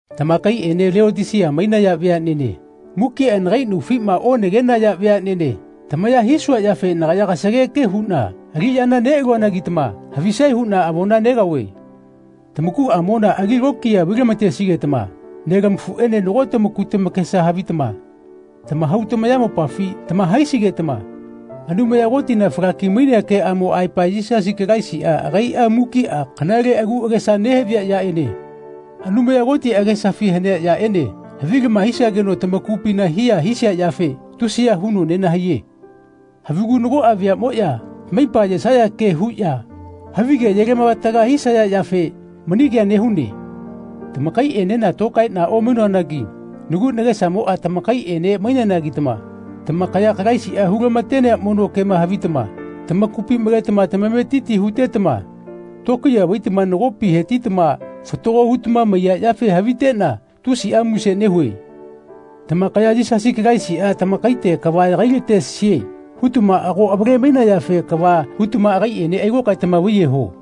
Tamakaiꞌene Leotisia mainaya veaꞌnene mukiꞌa nagai naufima onagenaya veaꞌnene tamaya hisua yafe nagaya kasageke huꞌna aliꞌyana neꞌaluanagitama havisae huꞌna avona negaove. Tamakuꞌamona ali lokiya vailamatesigetama nelamafuꞌene nago tamaku tamakesa havitama tamahau tamayamopafi tama-haisigetama Anumaya Kotina falaki-mainea keꞌamo aepa Yisasi Kalaisiꞌa agaiꞌa mukiꞌa kanale agu agesa nehavia yaꞌene Anumaya Koti agesafi hanea yaꞌene havilama hisageno tamakupina hiya hisia yafe tusiya huno nenahaiye. Havigu nagoꞌa veaꞌmoꞌya tamaipa ayesaya ke huꞌya havige ayelamavataga hisaya yafe mani kea nehue. Tamakaiꞌenena tokaeꞌna omainoanagi nagu nagesamoꞌa tamakaiꞌene maineanagitama tamakaya Kalaisiꞌa hulatenea mono kema havitama tamakupi maletama tamametiti hutetama tokiya vaitama nagopima hetitama fatago hutama maiya yafe haviteꞌna tusiꞌa muse nehue. Tamakaya “Yisasi Kalaisiꞌa tagaite kava yagai-latesie.” hutama ago avale-mainayafe kava hutama agaiꞌene ailokaetama vaiyeho.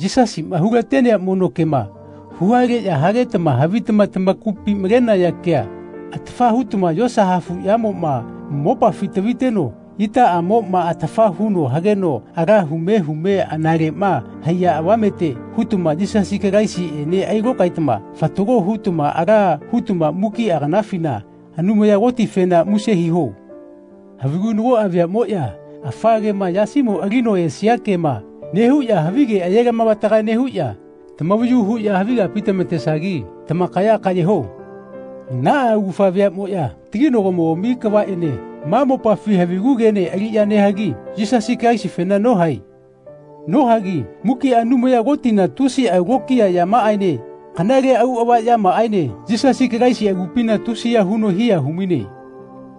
Yisasiꞌma hulatenea mono kema huhaleꞌya hagetama havitama tamakupi malenaya kea atafa hutama yosa hafuꞌyamoꞌma mopafi taviteno itaꞌamoꞌma atafa huno hageno ala hume hume analeꞌma haiya avamete hutama Yisasi Kalaisiꞌene ailokaetama fatago hutama ala hutama mukiꞌa kanafina Anumaya Kotifena muse hiho. Havigu nagoꞌa veaꞌmoꞌya afa kema, yasimo alino esia kema, nehuꞌya havige ayelamavataga nehuꞌya tamavayu huꞌya havi kapi tamatesagi tamakaya kaꞌye ho. Naꞌa augafa veaꞌmoꞌya taginagomogami kavaꞌene ma mopafi havigu kene aliꞌya nehagi Yisasi Kalaisifena nohae. Nohagi mukiꞌa Anumaya Kotina tusiꞌa lokiya yamaꞌaene kanale auꞌava yamaꞌaene Yisasi Kalaisi agupina tusiya huno hiya humaine.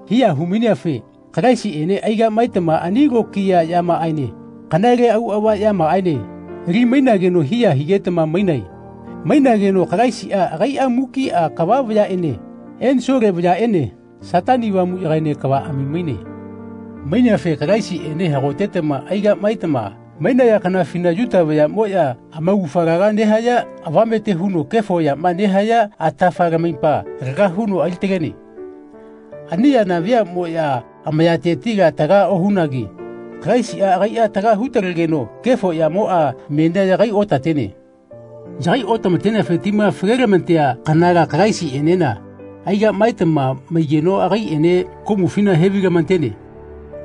Hiya humaineafe Kalaisiꞌene aigaꞌmaetama ani lokiya yamaꞌaene kanale auꞌava yamaꞌaene ali-mainageno hiya higetama mainae. Mainageno Kalaisiꞌa agaiꞌa mukiꞌa kava vayaꞌene ensole vayaꞌene Satani Avamuꞌyagaene kavaꞌami maine. Maineafe Kalaisiꞌene hagotetama aigaꞌmaetama mainaya kanafina Yuta vayaꞌmoꞌya amaugafa laga nehaya avamete huno kefo yama nehaya atafa lamaipa laga huno alitalene. Ani yana veaꞌmoꞌya amayatetila taga ohunagi Kalaisiꞌa agaiꞌa taga hu-talegeno kefo yamoꞌa menia yagai otatene. Yagai otamateneafe tima falelamatea kanala Kalaisiꞌenena aigaꞌmaetama maigeno agaiꞌene komufina hevailamatene.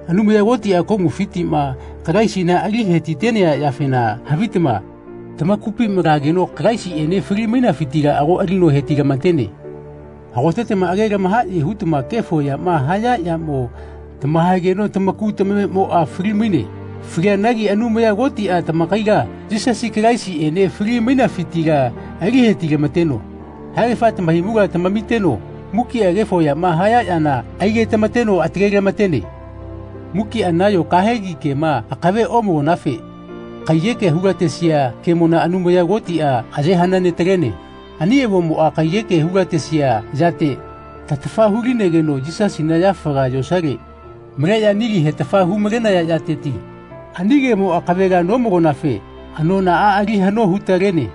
Anumaya Kotiꞌa komufitiꞌma Kalaisina ali hetitenea yafena havitama tamakupi malageno Kalaisiꞌene fali-mainafitila ago ali hetilamatene. Hagotetama age lamahaꞌye hutama kefo yama haya yamo tamahaegeno tamaku tamamemoꞌa fali-maine. Falianagi Anumaya Kotiꞌa tamakaila Yisasi Kalaisiꞌene fali-mainafitila ali hetilamateno haegafa tamahaimula tamamiteno mukiꞌa kefo yama haya yana aigetamateno atale-lamatene. Mukiꞌa nayo kahegi kema akave omalonafe kaiyekea hulatesia kemona Anumaya Kotiꞌa aye hanane-talene. Ani avomoꞌa kaiyeke hulatesia yate tatafa hu-linegeno Yisasina yafaga yosale maleꞌya nili hetafa hu-malenaya yateti ani kemo akavela nomalonafe anonaꞌa ali haꞌno hu-talene.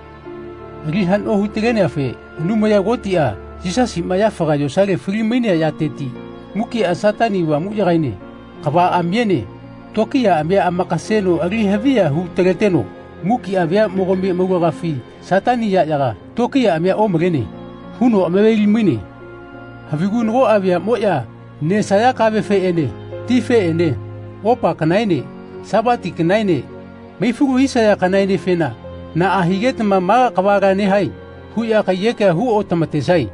Ali haꞌno hu-taleneafe Anumaya Kotiꞌa Yisasiꞌma yafaga yosale fali-mainea yateti mukiꞌa Satani Avamuꞌyagaene kavaꞌamiene tokiyaꞌamia amakaseno alihaviya hu-taleteno mukiꞌa veaꞌmogami amaulagafi Satani yaꞌyaga “Tokiyaꞌamia omalene.” huno amaveli-maine. Havigu nagoꞌa veaꞌmoꞌya nesaya kavefeꞌene tifeꞌene opa kanaene sapati kanaene maifalu hisaya kanaenefena “Naꞌa higetama ma kavala nehae.” huꞌya kaiyekea hu otamatesae.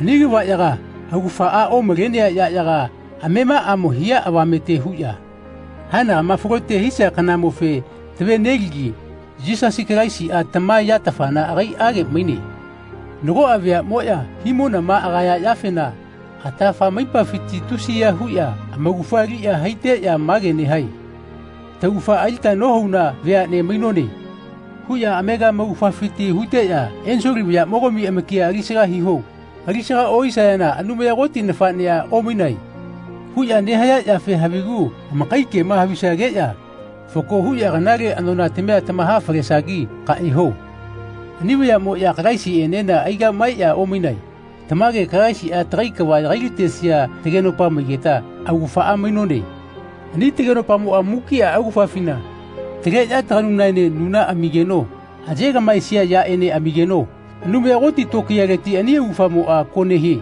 Ani kavaꞌyaga augafaꞌa omalenea yaꞌyaga amemaꞌamo hia avamete huꞌya haenagama falote hisia kanamofe tave-neligi Yisasi Kalaisiꞌa tama yatafana agaiꞌage maine. Nagoꞌa veaꞌmoꞌya himonama agaya yafena atafa amaipafiti tusiya huꞌya amaugafa aliꞌya haiteꞌya mage nehae “Taugafa alita nohauna veaꞌne mainone.” huꞌya amega amaugafafiti huteꞌya “Ensole vayaꞌmogami amakia alisaga hiho. Alisaga ohisayana Anumaya Koti nafaꞌnea omainae.” huꞌya nehaya yafe havigu amakai kema havisageꞌya fako huꞌya kanale anonatamia tamaha-falesagi kaꞌye ho. Ani vayaꞌmoꞌya Kalaisiꞌenena aigaꞌmaeꞌya omainae. Tamage Kalaisiꞌa tagai kava yagailatesia tagenopa maigeta augafaꞌa mainone. Ani tagenopamoꞌa mukiꞌa augafafina taleꞌya taganunaene nuna amigeno ayegaꞌmaesia yaꞌene amigeno Anumaya Koti tokiyaleti ani augafamoꞌa ko nehie.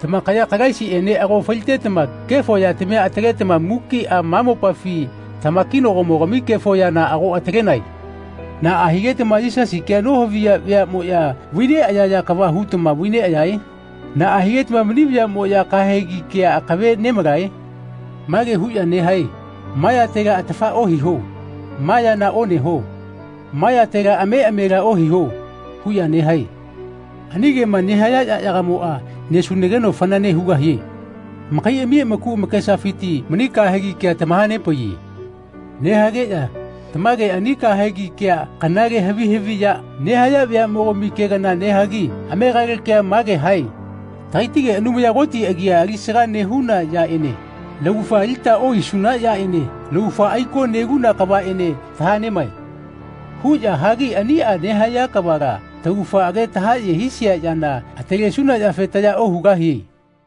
Tamakaya Kalaisiꞌene ago falitetama kefo yatamia ataletama mukiꞌa ma mopafi tamakinagomogami kefo yana ago atalenae. Naꞌa higetama Yisasi kea nohaviya veaꞌmoꞌya vaineꞌayaya kava hutama vaineꞌayae? Naꞌa higetama mani vayaꞌmo kahegi kea akave nemalae? Mage huꞌya nehae “Ma yatela atafa ohiho. Ma yana oneho. Ma yatela ameꞌamela ohiho.” huꞌya nehae. Ani kema nehaya yaꞌyagamoꞌa nesunageno fanane hugahie. Amakaiꞌami amaku amakesafiti mani kahegi kea tamahanepaiye. Nehageꞌya tamage ani kahegi kea kanale havi haviꞌya nehaya vayaꞌmogami kea kana nehagi amegale kea mage hae “Tagaitige Anumaya Koti agia alisaga nehuna yaꞌene laugafa alita ohaisuna yaꞌene laugafa aiko neluna kavaꞌene tahaꞌnemae.” huꞌya hagi ani nehaya kavala taugafa age tahaꞌye hisia yana atalesuna yafe taya ohugahie.